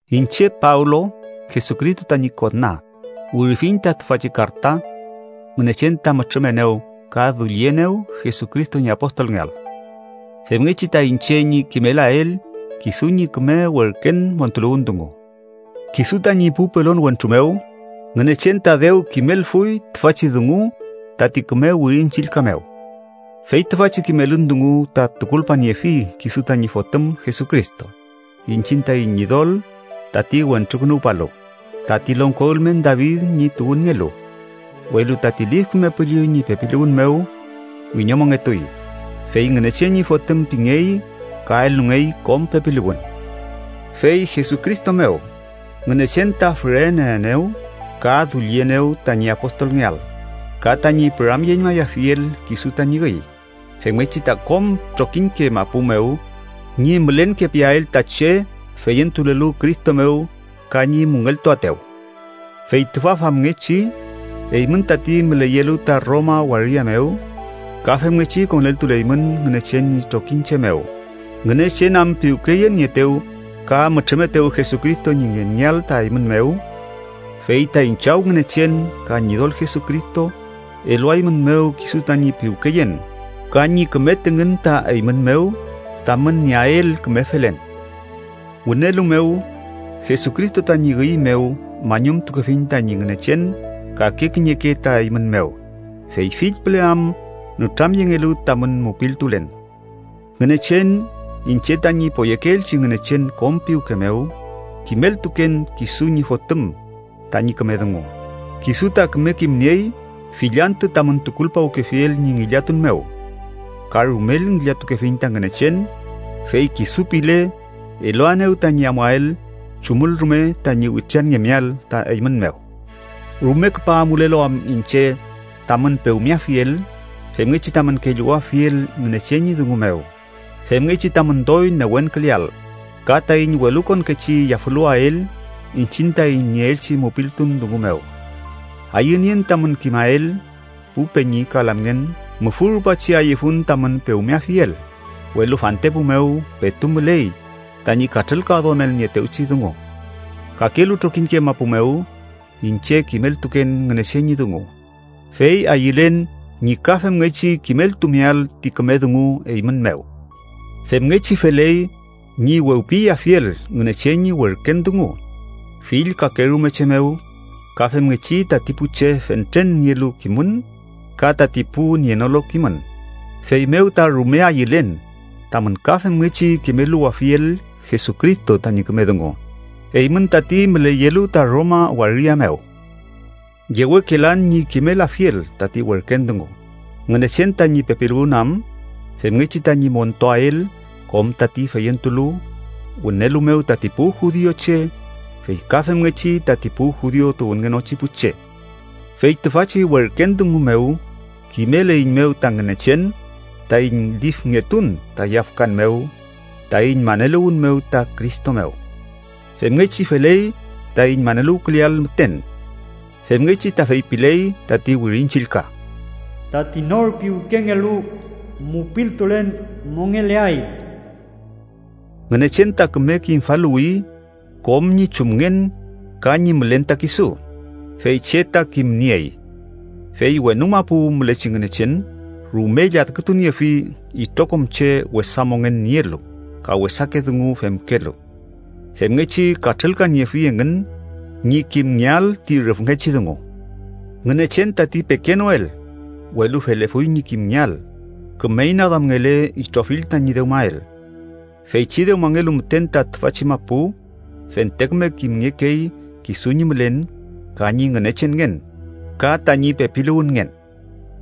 Iñche Pablo, Jesucristo tañi kona, wirifiñ ta tüfachi karta. Ngünechen ta mütrümenew ka dullienew Jesucristo ñi apostolngeael, femngechi ta iñche ñi kimelael kisu ñi küme werken montuluwün dungu. Kisu tañi pu pelon wentru mew, Ngünechen ta dew kimelfuy tüfachi dungu tati küme Wirin Chillka mew. Fey tüfachi kimelün dungu ta tukulpaniefi kisu tañi Fotüm Jesucristo, iñchiñ taiñ Ñidol tati Wentrukünuwpalu, tati longko ülmen David ñi tuwünngelu, welu tati Lif Küme Püllü ñi pepiluwün mew wiñomongetuy, fey Ngünechen ñi Fotüm pingey ka elungey kom pepiluwün. Fey Jesucristo mew, Ngünechen ta füreneenew ka dullienew tañi apostolngeael ka tañi püramyeñmayafiel kisu tañi üy, femngechi ta kom trokiñke mapu mew ñi mülenkepiael ta che feyentulelu Cristo mew ka ñi müngeltuaetew. Fey tüfa famngechi, eymün tati müleyelu ta Roma waria mew ka femngechi koneltuleymün Ngünechen ñi trokiñche mew, Ngünechen am piwkeyenieetew ka mütrümetew Jesucristo ñi ngengeael ta eymün mew. Fey taiñ Chaw Ngünechen ka Ñidol Jesucristo eluaeymünmew kisu tañi piwkeyen ka ñi küme tüngün ta eymün mew tamün nieael küme felen. Wünelu mew, Jesucristo tañi üy mew mañumtukefiñ tañi Ngünechen kake kiñeke ta eymün mew, fey fill püle am nütramyengelu tamün mupiltulen. Ngünechen, iñche tañi poyekeelchi Ngünechen kom piwke mew, kimeltuken kisu ñi Fotüm tañi küme dungu, kisu ta küme kimniey fill antü tamün tukulpawkefiel ñi ngillatun mew. Ka rumel ngillatukefiñ ta Ngünechen, fey kisu pile, eluaenew tañi amuael chumül rume tañi witranngemeael ta eymün mew. Rume küpa amulelu am iñche tamün pewmeafiel femngechi tamün kelluwafiel Ngünechen ñi dungu mew, femngechi tamün doy newenküleael, ka taiñ welukonkechi yafüluwael iñchiñ taiñ nieelchi mupiltun dungu mew. Ayünien tamün kimael, pu peñi ka lamngen, mufü rupachi ayüfun tamün pewmeafiel, welu fantepu mew petu müley tañi katrülkaduamelnieetewchi dungu. Kakelu trokiñke mapu mew iñche kimeltuken Ngünechen ñi dungu, fey ayülen ñi ka femngechi kimeltumeael ti küme dungu eymün mew. Femngechi feley ñi wewpiyeafiel Ngünechen ñi werken dungu fill kakerume che mew, ka femngechi tati pu che fentren nielu kimün ka tati pu nienolu kimün, feymew ta rume ayülen tamün ka femngechi kimeluwafiel Jesucristo tañi küme dungu, eymün tati müleyelu ta Roma waria mew. Yewekelan ñi kimelafiel tati werken dungu, Ngünechen tañi pepiluwün am femngechi tañi montuael kom tati feyentulu, wünelu mew tati pu judiuche, fey ka femngechi tati pu judiu tuwünngenochi pu che. Fey tüfachi werken dungu mew kimeleiñmew ta Ngünechen taiñ lifngetun ta yafkan mew taiñ maneluwün mew ta Cristo mew. Femngechi feley taiñ maneluwküleael müten. Femngechi ta feypiley tati Wirin Chillka: “Tati nor piwkengelu mupiltulen mongeleay.” Ngünechen ta küme kimfaluwi kom ñi chumngen ka ñi mülen ta kisu, fey che ta kimniey. Fey wenu mapu mülechi Ngünechen rume lladkütuniefi itrokom che wesa mongen nielu ka wesake dungu femkelu, femngechi katrülkaniefi engün ñi kimngeael ti rüfngechi dungu. Ngünechen tati pekenoel, welu felefuy ñi kimngeael, küme inaduamngele itrofill tañi dewmael. Feychi dewmangelu müten ta tüfachi mapu, fente küme kimngekey kisu ñi mülen ka ñi Ngünechenngen ka tañi pepiluwünngen.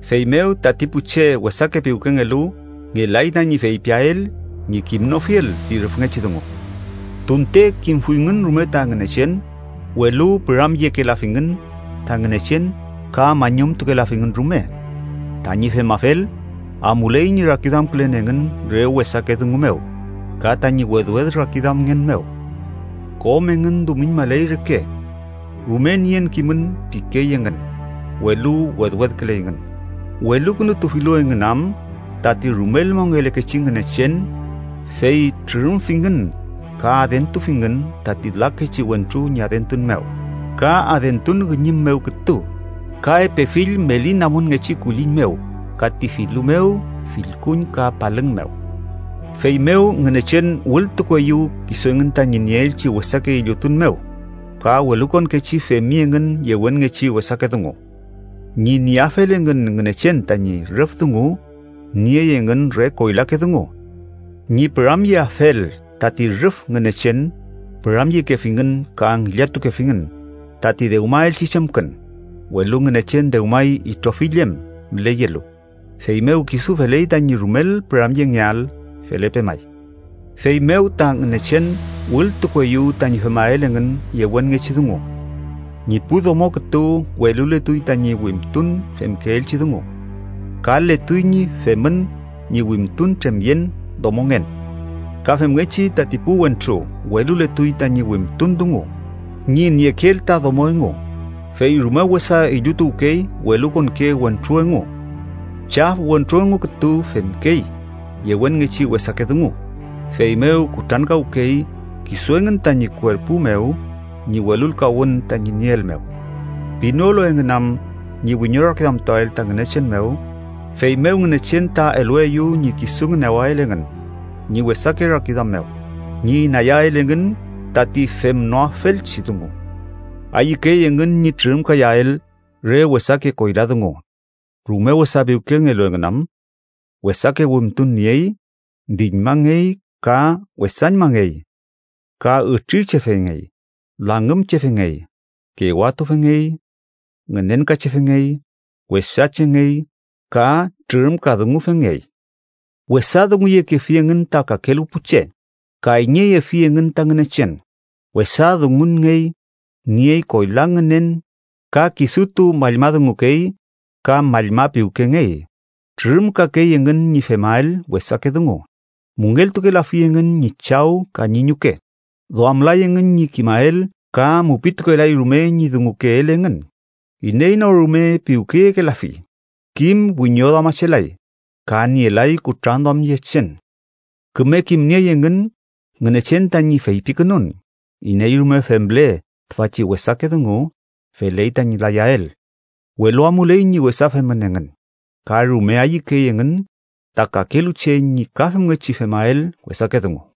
Feymew tati pu che wesake piwkengelu ngelay tañi feypiael ñi kimnofiel ti rüfngechi dungu. Tunte kimfuyngün rume ta Ngünechen, welu püramyekelafingün ta Ngünechen ka mañumtukelafingün rume. Tañi femafel, amuley ñi rakiduamkülen engün re wesake dungu mew, ka tañi wedwed rakiduamngen mew. Kom engün dumiñmaley reke. “Rume nien kimün” pikey engün, welu wedwedküley engün, welukünutufilu engün am tati rumel mongelekechi Ngünechen, fey trürümfingün ka adentufingün tati lakechi wentru ñi adentun mew, ka adentun üñüm mew kütu, ka epe fill meli namunngechi kulliñ mew ka ti filu mew, fillkuñ ka palüng mew. Feymew Ngünechen wültukueyew kisu engün tañi nieelchi wesake illutun mew, ka welukonkechi femi engün yewenngechi wesake dungu. Ñi nieafel engün Ngünechen tañi rüf dungu, niey engün re koylake dungu. Ñi püramyeafel tati rüf Ngünechen, püramyekefingün ka ngillatukefingün tati dewmaelchi chemkün, welu Ngünechen dewmay itrofill em müleyelu, feymew kisu feley tañi rumel püramyengeael. Felepe may. Feymew ta Ngünechen wültukueyew tañi femael engün yewenngechi dungu. Ñi pu domo kütu weluletuy tañi wimtun femkeelchi dungu. Kaletuy ñi femün ñi wimtun tremyen domongen. Ka femngechi, tati pu wentru weluletuy tañi wimtun dungu ñi niekeel ta domo engu, fey rume wesa illutuwkey welukonke wentru engu. Chaf wentru engu kütu femkey yewenngechi wesake dungu, feymew kutrankawkey kisu engün tañi kuerpu mew ñi welulkawün tañi nieel mew. Pinolu engün am ñi wiñorakiduamtuael ta Ngünechen mew, feymew Ngünechen ta elueyew ñi kisu ngünewael engün ñi wesake rakiduam mew, ñi inayael engün tati femnoafelchi dungu. Ayükey engün ñi trürümkayael re wesake koyla dungu, rume wesa piwkengelu engün am. Wesake wimtun niey, diñmangey ka wesañmangey. Ka ütrirchefengey, langümchefengey, kewatufengey, ngünenkachefengey, wesachengey ka trürümkadungufengey. Wesa dunguyekefi engün ta kakelu pu che, kayñeyefi engün ta Ngünechen, wesa dungunngey, niey koyla ngünen ka kisutu mallma dungukey ka mallma piwkengey, trürümkakey engün ñi femael wesake dungu, müngeltukelafi engün ñi chaw ka ñi ñuke, duamlay engün ñi kimael ka mupitukelay rume ñi dungukeel engün, iney no rume piwkeyekelafi, kim wiñoduamachelay, ka nielay kutranduamyechen. Küme kimniey engün Ngünechen tañi feypikünun iney rume femle tüfachi wesake dungu feley tañi layael, welu amuley ñi wesa femün engün, ka rume ayükey engün ta kakelu che ñi ka femngechi femael wesake dungu.